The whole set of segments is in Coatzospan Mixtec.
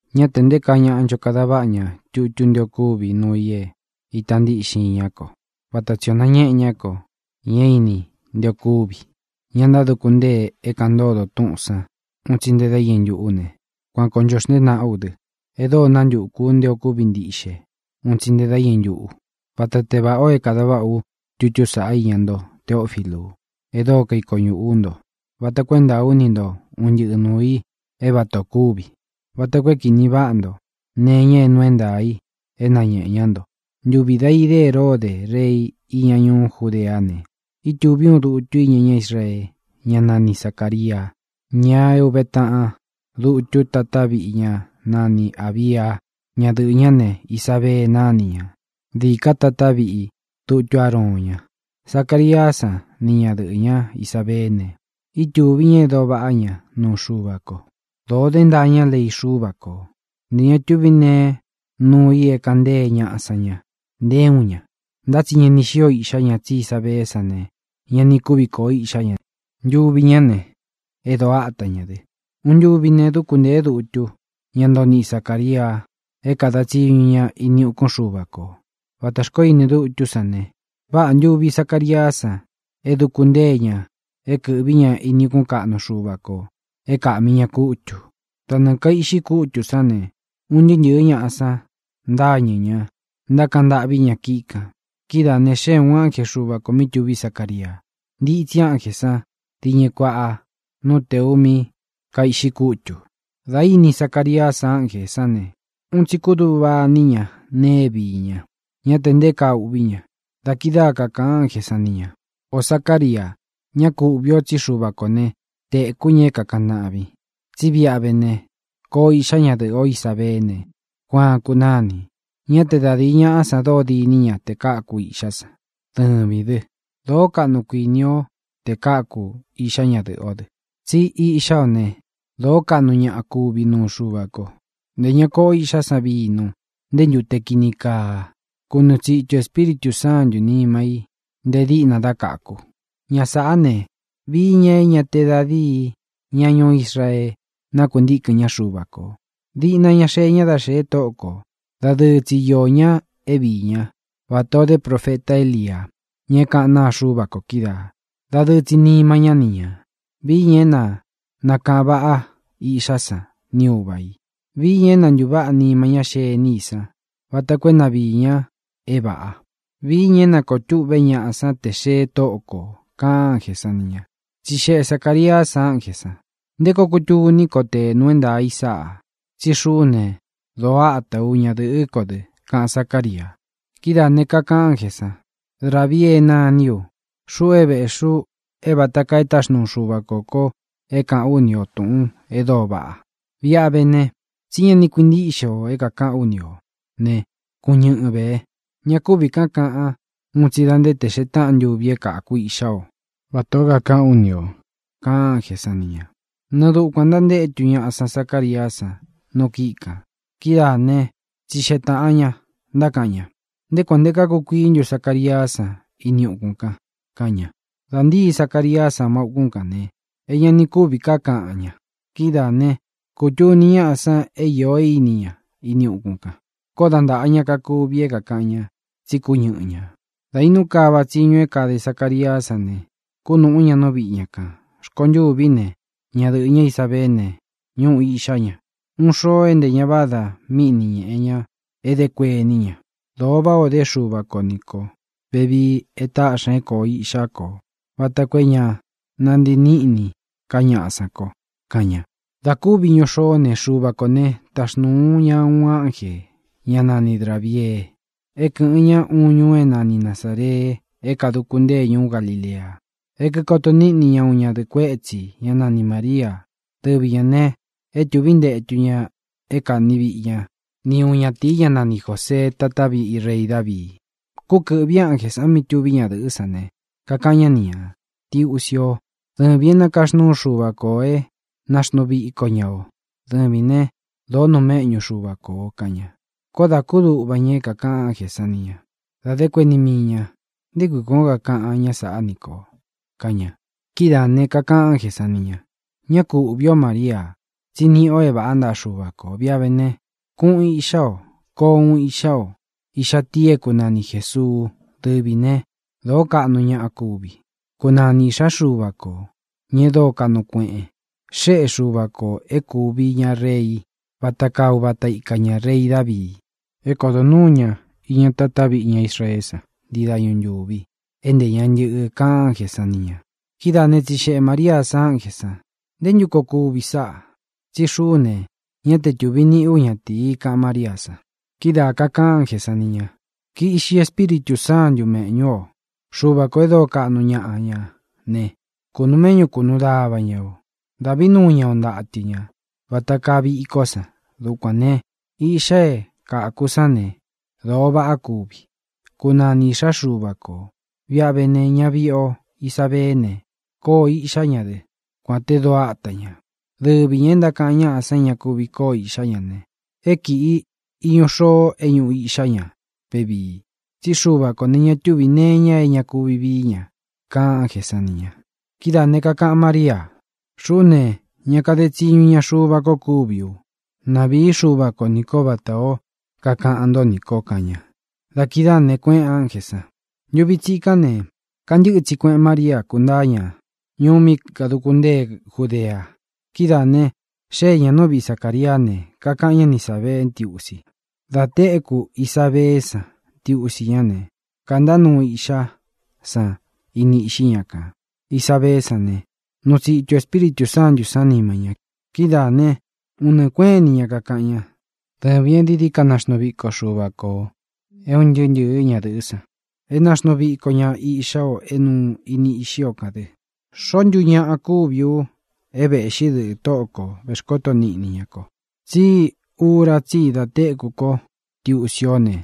Ñá tē nté kaa ñāꞌa ncho kada váꞌa ña tutú nté ō kúvi nuu i é īta ntíꞌxin iña ko. Vata tsī o nañéꞌē ñá kō, ña é īni nté ō kúvi, ña ntáduku ntée é kāꞌan ntódō túꞌūn sán un tsi nte dá iñɨ ntuꞌu ne, kuan kōo ncho xntée nāꞌá u dɨ, e dóo nántukū u nté ō kúvi ntiꞌxe un tsi nte dá iñɨ ntuꞌu. Vata te vāꞌá ō é kāda váꞌā ú tutú saꞌá iña nto, Teófilu, e dóo kaiko ñuꞌū ú nto, vata koo é ntāa ú ni ntō un ntɨꞌɨ nūu i é vatā o kúvi, vata koo é kīní vaꞌā ntó nee iña é nuu é ntaā i é nāñéꞌe ñá nto. Ntuvi dá idé Heródē rei iña ñuú Judeá ne, ítūví uun dutu íña ñá Israee, ñá nani Zacāria, ña é ūve taꞌan dutu tatá viꞌi ñá nani Ābia. Ñadɨꞌɨ̄ ñá ne, Isabee nani ña. Dɨvī ká tatá viꞌi dutu Ároon ña. Zacariá san ni ñadɨꞌɨ̄ ñá Isabeé ne, ntuvi ña e dóo vaꞌá ña nuu Xuva ko; dōo dé ntaa ñá lei Xúva kō. Ntē ña tuvi neé nuu i é kaꞌan ntée ñaꞌa san ña, nté uun ña. Ntá tsi ña ni xío iꞌxá ña, tsí Isabeé san ne, ña ni kúvi kōo íꞌxá ña; ntuvi ñá ne, é dōo áta ñā dɨ. Uun ntuvi ne, dúku ntēé dutu, ñá ntoo niꞌi Zacāria, é kāda tsiñu ña ini ukún Xuva kō. Vata xkoó ini dutú san ne, váꞌā ntuvi Zacariá san é dūku ntée ña é kɨ̄ꞌví ña ini ukún kaꞌnu Xuva kō é kíkaꞌmí ña kútū. Da nɨɨ̄ kaiꞌxi kútū sán ne, un ntɨɨ́ ntɨ̄ɨ́ ñaꞌa san ntáñɨ̄ ña, ntákaꞌan ntâꞌví ña kíꞌi kān. Kidáā ne, xée ūun ánje Xuva kō mí tuví Zacaria. Ntitsi ánjē san diñɨ kuaꞌa nú tēu mí kaiꞌxi kútū. Dā íni Zacariá san ánjē sán ne, un tsi kúduꞌva iní ña nee é viī ña; ñá tē nté kaa uꞌví ña. Da kidáa kakāꞌan ánjē san ni ña: —Ō Zácaria, ñá ku uꞌvī o, tsí Xuva kō né, tēkú ña é kākaꞌan ntaꞌvin. Tsí viꞌi a vé ne, koo iꞌxá ña dɨꞌɨ̄ ó Isabeé ne, Juaan kunáni. Ñá te da dīi ñaꞌa san dóo dini ña te káku iꞌxá san. Dɨvīn dɨ, dóo kaꞌnu kuinī ó te káku īꞌxá ñadɨ̄ꞌɨ ó dɨ. Tsí iꞌxá o ne, dōó kaꞌnu ñaꞌa kúvi nuu Xuva ko. Ntē ña koꞌo iꞌxá san vinu, nté ntute kini kaa. Kunuu tsitū Espíritū Sántū nima í nté dīꞌna dá káku. Ña sāꞌá ne, vií ña é ñā te da díi ña ñuú Israee nakuntíkɨ̄n ñá Xuva kō. Diꞌna ña xee ña dá xēe Tóꞌo kō. Dadɨɨ tsi iō ñá é viī ñá vatā o idé profeta Élia, ña é kaꞌán naa Xuva ko kídaā; dadɨɨ tsi nima ñá ni ñā. Vií ña é na nākaꞌan váꞌa iꞌxá san ni ūva i. Vii ña é na ntūváꞌa nima ñá xení i san vata koo é na viī ña é vāꞌa; vií ña é na kōo tûꞌvé ñaꞌa sán tē xee Tóꞌo kō —kaꞌan ánjē san ni ña. Tsixeꞌe Zacāriá san ánjē san: —¿Nté koo kutuní ko te nuu é ntaā i sáꞌā? Tsí xuꞌú ne, dōo átā ú; ñadɨ̄ꞌɨ́ ko dɨ —kaꞌan Zácaria. Kidáā ne, kakaꞌan ánjē san: —Grabiee nání u. Xuꞌu é vēꞌxi u é vāta kaa e táxnuu Xuva kō ko é kāꞌán u ni o tūꞌun e dóo vaꞌa. Viꞌi a vé ne, tsí ña ni kuintíꞌxe o é kākaꞌán u nī ó ne, kuñɨꞌɨn vē. Ña kúvī ká kāꞌan un tsi da nte te xee táꞌan ntuvi é kāku iꞌxá o, vatā ó kakaꞌán u nī o —kaꞌan ánjē san ni ña. Nɨɨ dukuān ntantétu ñaꞌa san Zacariá san nu kíꞌi kān. Kidáa ne, tsixeꞌe taꞌan ña, ntákaꞌan ña: —¿Nté kuān nté kakukuií ntu Zacariá san ini ukún kān? —kaꞌan ña. Dā ntíi Zacariá san ma ukún kān ne, é ña ni kúvī ká kaꞌan ña. Kidáā né, kūtuni ñáꞌa san é īo é īni ña ini ukún kān. Koó da ntāꞌa ña kakuvi é kākaꞌan ña, tsí kúñɨꞌɨ ñā. Dā inú kava tsiñu é kade Zacariá san ne, kúnūꞌú ña nú viꞌi ña kān. Rkontûví ne, ñadɨꞌɨ̄ ñá, Isabeé ne, ñúꞌū iꞌxá ña. Uꞌun xóō é ntē ña vádā mí ni ñēꞌe ña é dé kuení ña: “Dóo váꞌā o dé Xuva ko nī kó vevii e táꞌxi ña é kōo iꞌxá ko vata koo é ña nantii níꞌnī ká ñaꞌa sán ko”, kaꞌan ña. Dā kúvi iñu xoó ne, Xuva kō né, taxnūu ña uun ánjē, ñá nani Grābiee é kɨ̄ꞌɨn ña uun ñuu é nani Nazāree, é kāduku ntée ñuú Galilea, é kīkoto níꞌni ña uun ñadɨ̄ꞌɨ kuétsi, ñá nani Māria. Dɨvi ñā ne, e tuví ntetu ña é kani víꞌi ña ni uun ñatīi, ñá nani Jōsee, tatá viꞌi rei Davii. Kúkɨ̄ꞌvi ánjē san mí tuví ñadɨ̄ꞌɨ́ san ne, kakaꞌan ñá ni ñā: —¡Ntiusi o! Dɨvīn é nakaxnúu Xuva ko ō é naxnuu viko ña o. Dɨvīn ne, dóo nuu méꞌñu Xuva ko ō —kaꞌan ña. Koó dā kúduꞌva ña é kākaꞌan ánjē san ni ña. Da dé kuení mii ñā: “¿Nté kui kuān ó kakaꞌan ñá sāꞌá nī ko?”, kaꞌan ña. Kidáā ne, kakaꞌan ánjē san ni ña: —Ñá ku uꞌvī ó, Maria, tsí niꞌi o é vāꞌá ntaꞌa Xuva kō. Viꞌi a vé ne, kuꞌun iꞌxá o. Koo uun iꞌxá o, iꞌxá tii é kunani Jēsuu. Dɨvī né, dōó kaꞌnu ñaꞌa kúvi. Kunani īꞌxá Xuva kō, ña e dóo kaꞌnu kueꞌen. Xéꞌe Xuva kō é kuvi ña rei, vata kaa uvata ika ña, rei Dāvii, é kodo nuū ñá iña tatá viꞌi ñá Israeé san ntii dañu ntūvi, é ntē ña ntɨ́ꞌɨ —kaꞌan ánjē san ni ña. Kidáā ne, katsixeꞌe Mariá san ánjē san: —¿Nté ntu koo kuvi sáꞌā? Tsí xuꞌú ne, ñá te tūvi níꞌi ú ñatīi —kaꞌan Máriá san. Kidáa kākaꞌan ánjē san ni ña: —Kiꞌxi Espíritū Sántū méꞌñu ō. Xuva kō e dóo kaꞌnu ñaꞌa ña ne, kūnuu méꞌñu kunuu dava ña o. Dāꞌví nuu ña o ntatɨ ñā vata kaa viko san. Dukuān ne, iꞌxa é kaku sán ne, dóo vaꞌa kúvi. Kunani iꞌxá Xuva kō. Viꞌi a vé ne, ñaviꞌi o Isabeé ne, koo iꞌxá ña dɨ, kuān te dóo ata ñā. Dɨvi ñā e ntákaꞌan ñaꞌa san é ña kuvi koo iꞌxá ña ne, é kīꞌi iñu xoo é ñuꞌu iꞌxá ña vevii. Tsí Xuva kō ne, ña túvī nee iña é ña kuvi vií ña —kaꞌan ánjē san ni ña. Kidáā ne, kakaꞌan Mária: —Xuꞌú ne, ña kade tsiñu iña Xuva ko kúvi u. Na vīi Xúva ko nī kó vatā ó kakaꞌan ntó nī ko —kaꞌan ña. Da kidáā ne, kuéꞌēn ánjē san. Ntuvi tsikán ne, kantɨ́ꞌɨ tsi kueꞌen María, kúntāa ña ñuú mí kaduku ntée Judea. Kidáā ne, xée ñā nú viꞌi Zacāriá ne, kakaꞌan ñá ni Isābeé ntiusi. Dā téku Isabeé san ntiusi ñá ne, kāntá nuu iꞌxá san ini iꞌxí ña kān. Isabeé san ne, nuu tsitu Espíritū Sántū san nima ña. Kidáā ne, un nɨɨ kuéꞌen ini ña kakaꞌan ñá: —¡Dɨvīn e dií dií ka naxnuu víko Xuva ko ō é un ntɨɨ́ ntɨ̄ɨ́ ñadɨ̄ꞌɨ́ san! ¡É nāxnuu viko ña iꞌxá o é nuu ini iꞌxí o kān dɨ! ¿Xoó ntu ñaꞌa kúvi u é vēꞌxí dɨꞌɨ̄ Tóꞌō kó, vexkoto niꞌni ña ko? Tsí ura tsí i da téku ko ntiusi ó ne,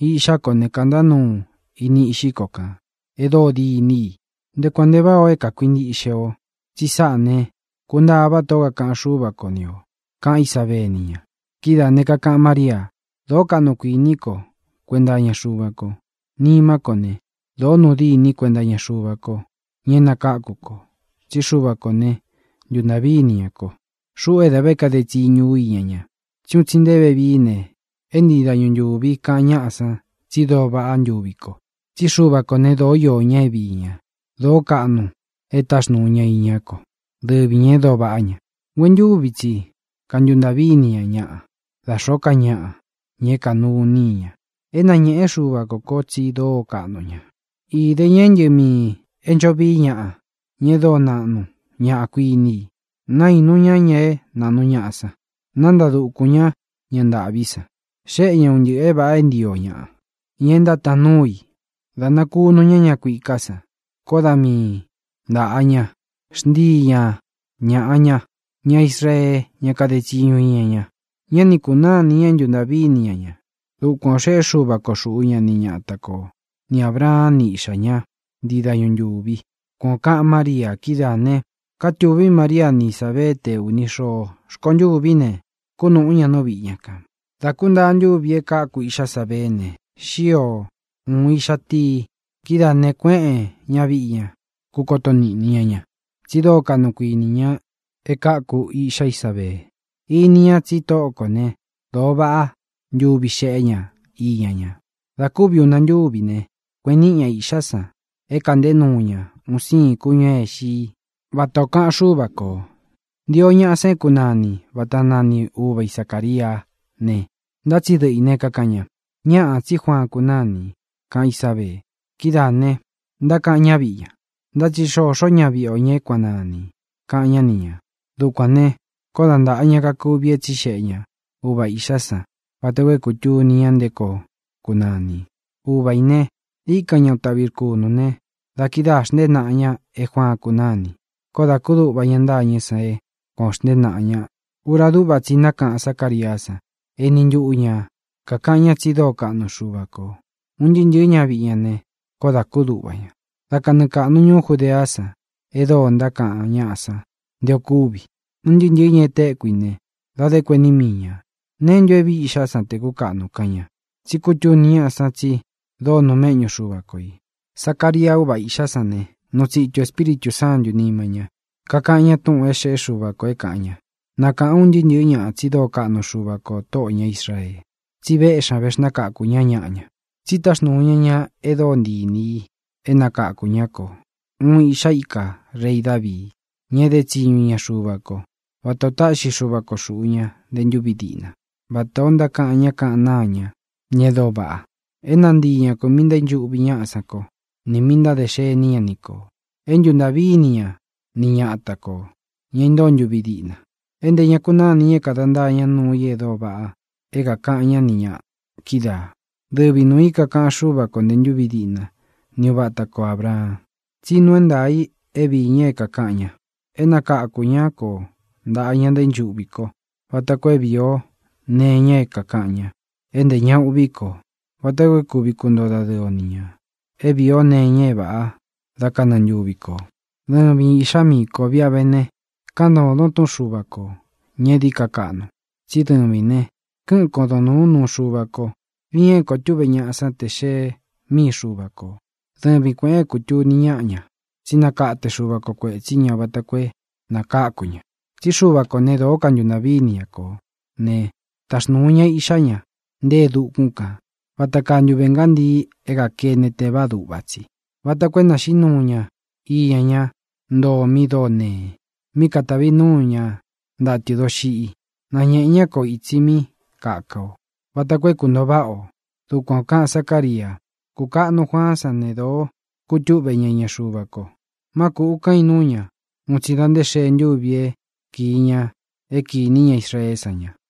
iꞌxá ko ne, kāntá nuu ini iꞌxí ko kān e dóo diní i. ¡Nché kuān nche váꞌā o é kākuinchiꞌxe o, tsi sáꞌā ne, kuntaa vátā ó kakaꞌan Xúva ko ni ō! —kaꞌan Ísabee ni ña. Kidáā ne, kakaꞌan Mária: Dōó kaꞌnu kuiní ko kuenta iña Xuva ko. Nimá ko ne, dōó nuu dîni kuenta iña Xuva ko, ña é nakākú ko. Tsí Xuva kō né, ntūntaꞌví ini ña ko, xuꞌu é da kade tsiñu ú iña ña. Un tsi nché vevií ne, é nchii dañu ntūví kaꞌan ñáꞌa san tsi dóo váꞌa ntuvi ko. Tsí Xuva kō né, dōó iō ña é viī ña; dōó kaꞌnu e táxnūu ña iñá ko. ¡Dɨvi ñā e dóo vaꞌá ña! Nguentúvi tsi kantuntaꞌví ini ña ñaꞌa, da xōó ka ñaꞌa, ña é kānuní i ña. E nañéꞌe Xúva kō kó tsi dóo kaꞌnu ña; īde ña é ntɨꞌɨ miī é ncho vií ñaꞌa, ña e dóo naꞌnu ñaꞌa kuiní i; naīnu ñá ña é naꞌnu ñaꞌa san, nántaa dūkun ñá ña ntāꞌví san. Xéꞌe ña un ntɨꞌɨ̄ é vāꞌa é nchio ñaꞌa, ña é ntátaan núu i. Dá nakūnu ña ña kuiká san, koó da mii ntāꞌa ña. Xnchii ña ñāꞌa ña, ñá Israee, ña kade tsiñu iña ña; ñá ni kūnáa ini ña é ntuntaꞌví ini ña ña. Dukuan ō xeꞌé Xuva ko xūꞌu ñá ni ñata kō, ni Ābraan ni iꞌxá ña, nchii dañu ntūvi. Kuan ō kaꞌan Mária. Kidáā ne, kátūví Maria ni Isábeé te ūni xoo. Rkontûví ne, kúnūꞌún ña nú viꞌi ña kān. Dā kúntaa ntúvī é kāku iꞌxá Isabeé ne, xío ūun iꞌxa tii. Kidáā ne, kuéꞌen ñaviꞌi ña, kūkoto níꞌni ña ña, tsi dóo kaꞌnu kuīni ña e káku iꞌxá Isabee. Ini ña tsí Tóꞌo kō né, dōo váꞌa ntuvi xéꞌe ña iña ña. Dā kúvi una ntúvi ne, kueꞌen níꞌi ñā iꞌxá san é kāꞌnté nuu ña un siin kúñū é ixi i, vata ō kaꞌan Xúva kō. Ntīo ñaꞌa san é kunani vata nani uva i Zacāriá ne, ntá tsi dɨꞌɨ ī né, kakaꞌan ña: —Ñáꞌā, tsí Juaan kunáni —kaꞌan Ísabee. Kidáā ne, ntákaꞌan ñáviꞌi ña: —Ntá tsi xoxó ñaviꞌi o, ña é kuan nanī —kaꞌan ñá ni ñā. Dukuān ne, koó dā ntaꞌa ña kakuvi é tsixeꞌe ña ūva iꞌxá san vata koo é kūtuni ña nté koo kunani. Uva ī ne, íkan ña uun taꞌvi rkunū ne, da kidáā xntée naꞌa ña é Juaan kunáni. Koó dā kúduꞌva ña ntâñɨ́ san é kuān o xntée naꞌa ña. Ura dúꞌva tsi i nákaꞌan Zácariá san. Eni ntuꞌu ña kākaꞌan ña tsi dóo kaꞌnu Xuva kō. Un ntɨɨ́ ntɨ̄ɨ́ ñaviꞌi ña ne, koó dā kúduꞌva ña. Da kanɨɨ kāꞌnu ñuú Judeá san e dóo ntákaꞌan ñáꞌa san nté ō kúvi. Un ntɨɨ́ ntɨ̄ɨ́ ña e téku i ne, da dé kuení mii ñā: —¿Neé ntu é vīi iꞌxá san tē kúkaꞌnu? —kaꞌan ña. Tsí kutuní ñaꞌa san tsi dóo nuu méꞌñu Xuva ko ī. Zacaria, úva īꞌxá san ne, nuu tsitu Espíritū Sántū nima ñá, kakaꞌan ñá túꞌūn é xēꞌé Xuva kō é kāꞌan ña: ¡Na kāꞌan un ntɨɨ́ ntɨ̄ɨ́ ñaꞌa tsi dóo kaꞌnu Xuva kō, Tóꞌō ña Israee, tsi véꞌxi ñā, vexnákakū ñá ñaꞌa ña! Tsi táxnūu ña ña e dóo ntii inī i é nakakū ñá kō, uun iꞌxá ika rei Dāvii, ña é dé tsiñu iña Xuva ko, vata ō táꞌxi Xuva ko xūꞌu ña nte ntúvi diꞌna, vata ō ntákaꞌan ñá kaꞌán naa ña, ña e dóo vaꞌa: é nantii ña kō míꞌī ntaínchuꞌvi ñáꞌa san ko, nī mí ntáde xení ña ni kō, é ntuntaꞌví ini ña ni ñata kō, ña intóo ntuvi diꞌna, é ntē ña kunánī ña é kada ntáa ña nuu i e dóo vaꞌa é kākaꞌan ñá ni ñā kídaā. Dɨvi nuū i é kākaꞌan Xúva kō nte ntúvi diꞌna ni uva ata ko Ābraan tsí nuu é ntaā i é viī ña é kākaꞌan ña: é nakāku ñá ko ntaꞌa ña ntaínchuꞌvi ko vata koo é vīi o nee iña é kākaꞌan ña, é ntē ña uꞌví kō, vata koo é kuvi kuntoo dadɨɨ o ni ñā é vīi ó nee iña é vāꞌá da kanɨɨ ntuvi kō. Dɨvin, īꞌxá miī kó, viꞌi a vé ne, káꞌan ntōdon túꞌun Xuva kō, ña é dií ka kaꞌnu, tsí dɨvīn ne, kɨ́ꞌɨn kodōn núun nuu Xuva ko, viin é koo túꞌve ñaꞌa san te xee míi Xuva kō. Dɨvin kuēꞌen é kūtuni ñáꞌa ña tsí nakate Xuva ko kuētsí ña vata koo é nakáku ña. Tsí Xuva kō né, dōó kantuntaꞌví ini ña kō né, taxnūu ña iꞌxá ña nte e dukún kān vata kaa ntuve ngántii é kakene tevaá duꞌva tsi, vata koo é nāxiꞌí nuu ña iña ñá ntoo mi dóo nee, mí katāvi núu ña ntatɨ̄ doxiꞌi. Nañēꞌe ñá ko ītsi mí kaka ō vata koo é kūntoo váꞌa o. Dukuan ō kaꞌan Zacária. Kūkaꞌnu Juaán san ne, dōo kutúꞌve ña iña Xuva ko. Má kūꞌu kan inúu ña un tsi da nté xee ntúvī é kiī ña é kīní ña Israeé san ña.